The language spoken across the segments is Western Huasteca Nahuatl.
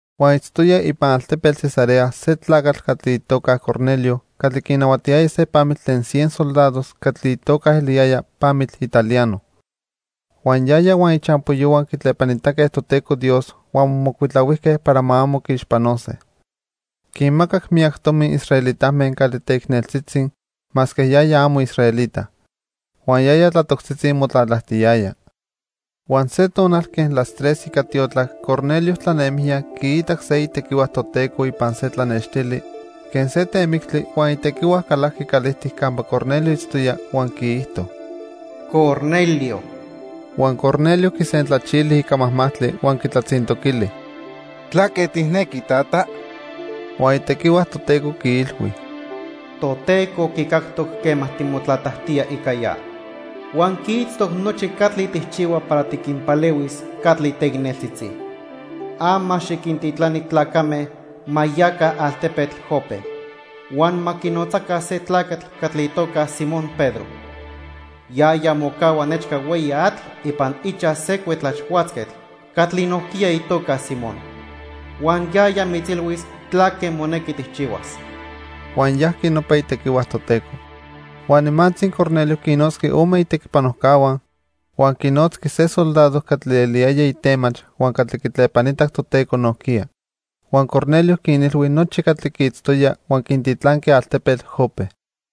Huan itztoya ipan altepetl Cesarea se tlacatl catli itoca Cornelio catli quinahuatiyaya se pamitl tlen cien soldados catli itoca eliyaya Pamitl Italiano. Huan yaya huan ichampoyohua quitlepanitaque Toteco Dios huan momocuitlahuijque para ma amo quiixpanose. Quinmacac miyac tomi israelitame catli teicneltzitzi masque yaya amo israelita. Huan yaya tlatoctzitzi motlatlajtiyaya. Huan se tonal quen las tres ica tiotlac Cornelio tlanemijya quiitac se itequihua Toteco ipan se tlanextili quen se temictli huan itequihua calajqui calijtic campa Cornelio itztoya huan quiijto: "¡Cornelio!" Huan Cornelio quisentlachili ica majmajtli huan quitlatzintoquili: "¿Tlaque tijnequi, tata?" Huan itequihua Toteco quiilhui: "Toteco quicactoc quema timotlatlajtía ica ya, huan quiitztoc nochi catli tijchihua para tiquinpalehuis catli teicneltzitzi. Ama xiquintitlani tlacame ma yaca altepetl Jope, huan ma quinotzaca se tlacatl catli itoca Simón Pedro. Yaya mocahua nechca hueyi atl ipan ichaj se cuetlaxhuatzquetl catli nojquiya itoca Simón. Huan yaya mitzilhuis tlaque monequi tijchihuas." Huan yajqui nopa itequihua Toteco. Huan nimantzi Cornelio quinnotzqui ome itequipanojcahua, huan quinotzqui se soldado catli eliyaya itemach huan catli quitlepanitac Toteco nojquiya. Huan Cornelio quinilhui nochi catli quiitztoya huan quintitlanqui altepetl Jope.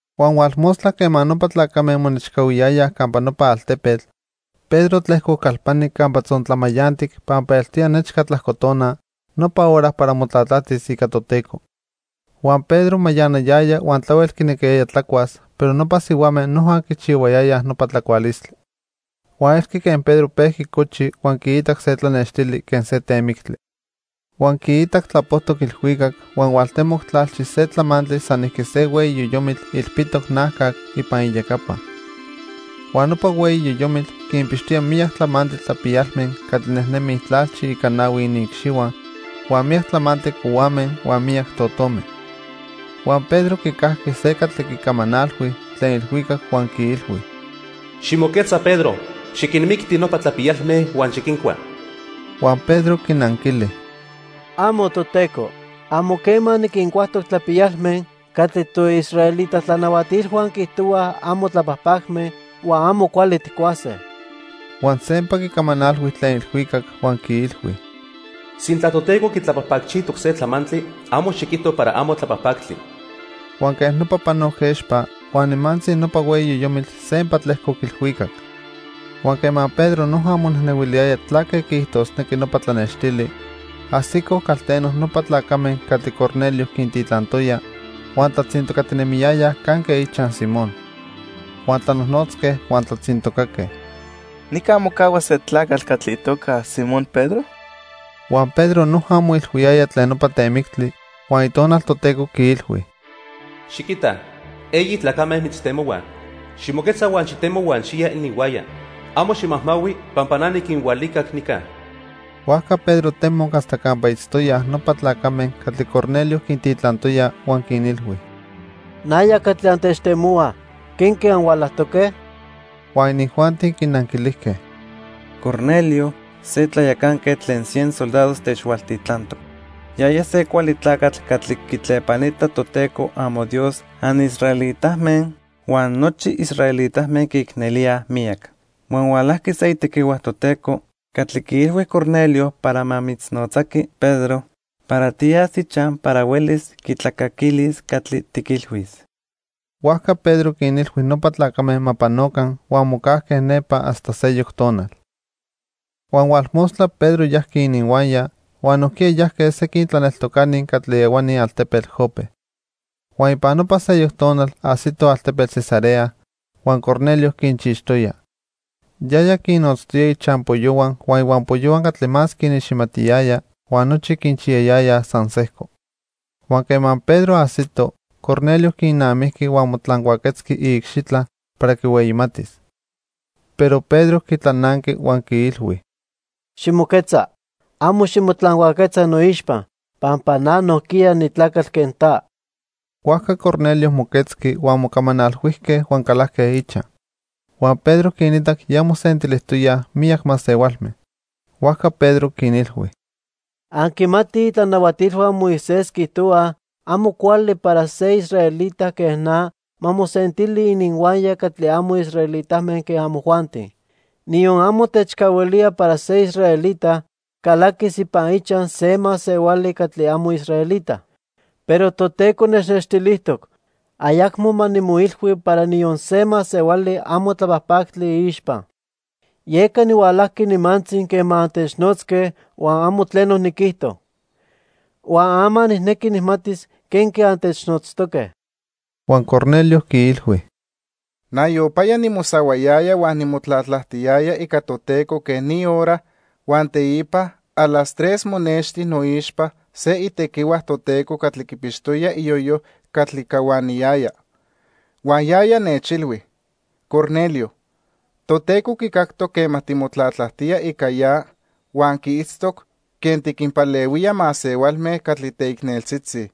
Huan hualmostla quema nopa tlacame monechcahuiyayaj campa nopa altepetl, Pedro tlejcoc calpani campa tzontlamayantic pampa eltoya nechca tlajcotona, nopa hora para motlatlajtis ica Toteco. Huan Pedro mayanayaya huan tlahuel quinequiyaya tlacuas, pero nopa sihuame noja quichihuayayaj nopa tlacualistli. Huan elqui quen Pedro pejqui cochi huan quiitac se tlanextili quen se temictli. Huan quiitac tlapojtoc ilhuicac huan hualtemoc tlalchi se tlamantli sanijqui se hueyi yoyomitl ilpitoc najcac ipan iyecapa. Huan nopa hueyi yoyomitl quinpixtoya miyac tlamantli tlapiyalme catli nejnemij tlalchi ica nahui iniicxihua huan miyac tlamantli cohuame huan miyac totome. Huan Pedro quicajqui se catli quicamanalhui tlen ilhuicac huan quiilhui: "Ximoquetza Pedro, xiquinmicti nopa tlapiyalme huan xiquincua." Huan Pedro quinanquili: "¡Amo, Toteco! Amo quema niquincuajtoc tlapiyalme catli toisraelita tlanahuatilhua quiijtohua amo tlapajpacme huan amo cuali tijcuase." Huan sempa quicamanalhui tlen ilhuicac huan quiilhui: "Sintla Toteco quitlapajpacchijtoc se tlamantli, amo xiquijto para amo tlapajpactli." Huan quej nopa panoc expa, huan nimantzi nopa hueyi yoyomitl sempa tlejcoc ilhuicac. Huan quema Pedro noja monejnehuiliyaya tlaque quiijtosnequi nopa tlanextili, ajsicoj calteno nopa tlacame catli Cornelio quintitlantoya, huan tlatzintocatinemiyayaj canque ichaj Simón. Huan tlanojnotzque huan tlatzintocaque: "¿Nica mocahua se tlacatl catli itoca Simón Pedro?" Huan Pedro noja moilhuiyaya tlen nopa temictli, huan Itonal Toteco quiilhui: "Xiquita, eyi tlacame mitztemohuaj. Ximoquetza huan xitemo huan xiya ininhuaya. Amo ximajmahui pampa na niquinhualicac nica." Huajca Pedro temoc hasta campa itztoyaj nopa tlacame catli Cornelio quintitlantoya huan quinilhui: —Naya catli antechtemohuaj. ¿Quenque anhualajtoque? Huan inijuanti quinanquilijque: —Cornelio, se tlayacanquetl tlen cien soldados, techhualtitlantoc. Yaya se cuali tlacatl catli quitlepanita Toteco amoDios anisraelitame huan nochi israelitame quiicnelíaj miyac. Huan hualajqui se itequihua Toteco catli quiilhui Cornelio para ma mitznotzaqui, Pedro, para tiyas ichaj para huelis quitlacaquilis catli tiquilhuis. Huajca Pedro quinilhui nopa tlacame ma panoca huan mocajque nepa hasta seyoc tonal. Huan hualmostla Pedro yajqui ininhuaya, huan nojquiya yajque sequin tlaneltocani catli ehuani altepetl Jope. Huan ipan nopa seyoc tonal ajsitoj altepetl Cesarea, huan Cornelio quinchixtoya. Yaya quinnotztoya ichampoyohua huan ihuampoyohua catli más quiniximatiyaya huan nochi quinchiyayayaj san sejco. Huan quema Pedro ajsito, Cornelio quinamijqui huan motlancuaquetzqui iicxitla para quihueyimatis. Pero Pedro quitlananqui huan quiilhui: —Ximoquetza, amo ximotlancuaquetza noixpa, pampa na nojquiya nitlacatl quen ta. Huajca Cornelio moquetzqui, huan mocamanalhuijque huan calajque ichaj. Huan Pedro quinitac ya mosentilijtoyaj miyac masehualme. Huajca Pedro quinilhui: —Anquimatij itlanahuatilhua Moisés quiijtohuaj amo cuali para se israelita quen na ma mosentili ininhuaya catli amo israelitame quen amojuanti. Niyon amo techcahuilía para se israelita calaquis ipan ichaj se masehuali catli amo israelita. Pero Toteco nechnextilijtoc ayacmo ma nimoilhui para niyon se masehuali amo tlapajpactli iixpa. Yeca nihualajqui nimantzi quema antechnotzque huan amo tleno niquijto. Huan ama nijnequi nijmatis quenque antechnotztoque. Huan Cornelio quiilhui: —Nayopaya nimosahuayaya huan nimotlatlajtiyaya ica Toteco quen ni hora, huan teipa a las tres monexti noixpa se itequihua Toteco catli quipixtoya iyoyo catli cahuaniyaya. Huan yaya nechilhui: 'Cornelio, Toteco quicactoc quema timotlatlajtía ica ya huan quiitztoc quen tiquinpalehuía masehualme catli teicneltzitzi.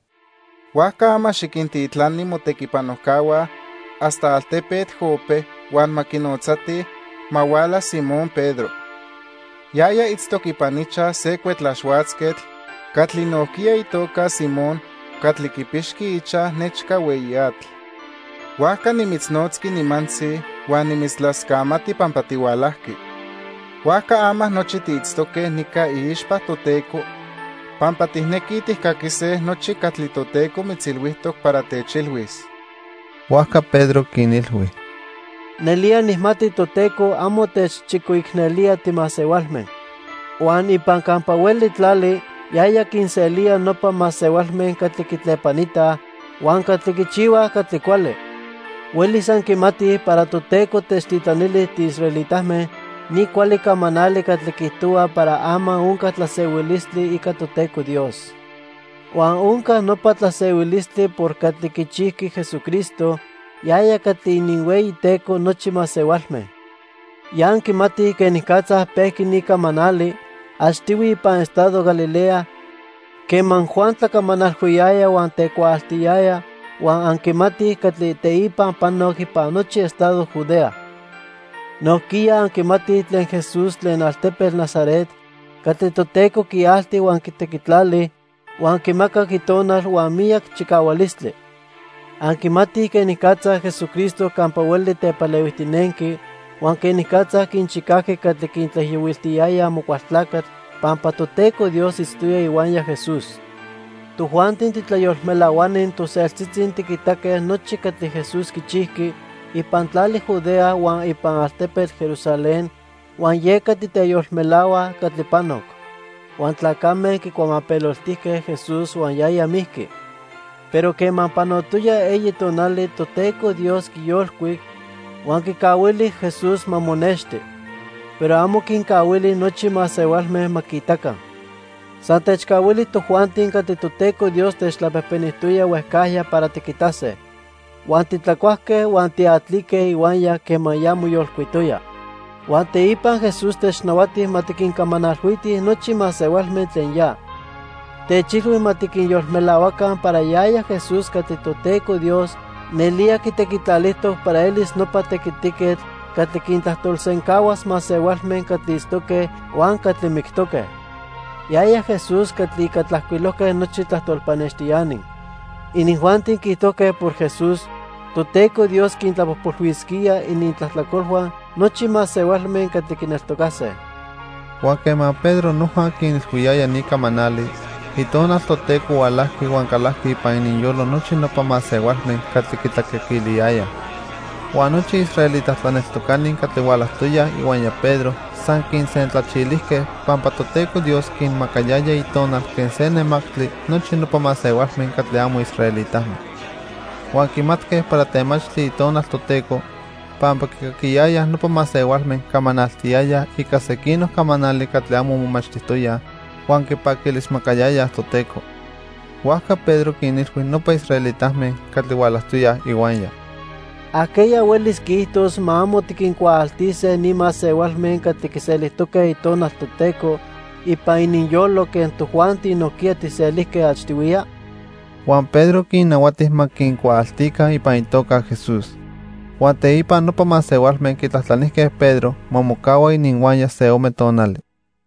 Huajca ama xiquintitlani motequipanojcahua hasta altepetl Jope, huan ma quinotzatij ma huala Simón Pedro. Yaya itztoc ipan ichaj se cuetlaxhuatzquetl catli nojquiya itoca Simón catli quipixqui ichaj nechca hueyi atl.' Huajca nimitznotzqui nimantzi huan nimitztlascamati pampa tihualajqui. Huajca ama nochi tiitztoque nica iixpa Toteco pampa tijnequij tijcaquise nochi catli Toteco mitzilhuijtoc para techilhuis. Huajca Pedro quinilhui: —Nelía nijmati Toteco amo techchicoicnelía timasehualme. Huan ipan campa hueli tlali yaya quinselía nopa masehualme catli quitlepanitaj huan catli quichihuaj catli cuali. Huelis anquimatij para Toteco techtitlanili tiisraelitame ni cuali camanali catli quiijtohua para ama onca tlasehuilistli ica Toteco Dios. Huan onca nopa tlasehuilistli por catli quichijqui Jesucristo, yaya catli ininhueyiTeco nochi masehualme. Ya anquimatij quenicatza pejqui ni camanali achtihui ipan estado Galilea quema Juan tlacamanalhuiyaya huan tecuaaltiyaya huan anquimatij catli teipa panoc ipan nochi estado Judea. Nojquiya anquimatij tlen Jesús tlen altepetl Nazaret catli Toteco quialti huan quitequitlali, huan quimacac Itonal huan miyac chicahualistli. Anquimatij quenicatza Jesucristo campa hueli tepalehuijtinenqui huan quenicatza quinchicajqui catli quinijiyohuiltiyaya Amocualtlacatl pampa Toteco Dios itztoya ihuaya Jesús. "Tojuanti titlayolmelahuani toseltzitzi tiquitaque nochi catli Jesús quichijqui ipan tlali Judea huan ipan altepetl Jerusalén huan yeca titeyolmelahuaj catli panoc. Huan tlacame quicuamapeloltijque Jesús huan yaya mijqui. Pero quema panotoya eyi tonali, Toteco Dios quiyolcuic, huan quicahuili Jesús ma monexti. Pero amo quincahuili nochi masehualme ma quiitaca. San techcahuili tojuanti catli Toteco Dios techtlapejpenijtoya huejcajya para tiquitase. Huan titlacuajque huan tiatlique ihuaya quema ya moyolcuitoya. Huan teipa Jesús technahuati ma tiquincamanalhuitij nochi masehualme tlen ya. Techilhui ma tiquinyolmelahuaca para yaya Jesús catli Toteco Dios nelía quitequitlalijtoc para elis nopa tequitiquetl catli quintlajtolsencahuas masehualme catli itztoque huan catli mictoque. Yaya Jesús catli ica tlajcuilojque nochi tlajtol pannextiani. Inijuanti quiijtojque para Jesús, Toteco Dios quintlapojpolhuisquía inintlajtlacolhua nochi masehualme catli quineltocase." Huan quema Pedro noja quinilhuiyaya ni camanali, Itonal Toteco hualajqui huan calajqui ipan ininyolo nochi nopa masehualme catli quitlacaquiliyayaj. Huan nochi israelita tlaneltocani catli hualajtoyaj ihuaya Pedro san quinsentlachilijque pampa Toteco Dios quinmacayaya Itonal quen se nemactli nochi nopa masehualme catli amo israelitame. Huan quimatque para temachtli Itonal Toteco pampa quicaquiyayaj nopa masehualme camanaltiyayaj ica sequinoc camanali catli amo momachtijtoyaj huan quipaquilismacayayaj Toteco. Huajca Pedro quinilhui nopa israelitame catli hualajtoyaj ihuaya: —¿Ajqueya huelis quiijtos ma amo tiquincuaaltise ni masehualme catli quiselijtoque Itonal Toteco ipan ininyolo quen tojuanti nojquiya tijselijque achtihuiya? Huan Pedro quinnahuati ma quincuaaltica ipan itoca Jesús. Huan teipa nopa masehualme quitlajtlanijque Pedro ma mocahua ininhuaya se ome tonali.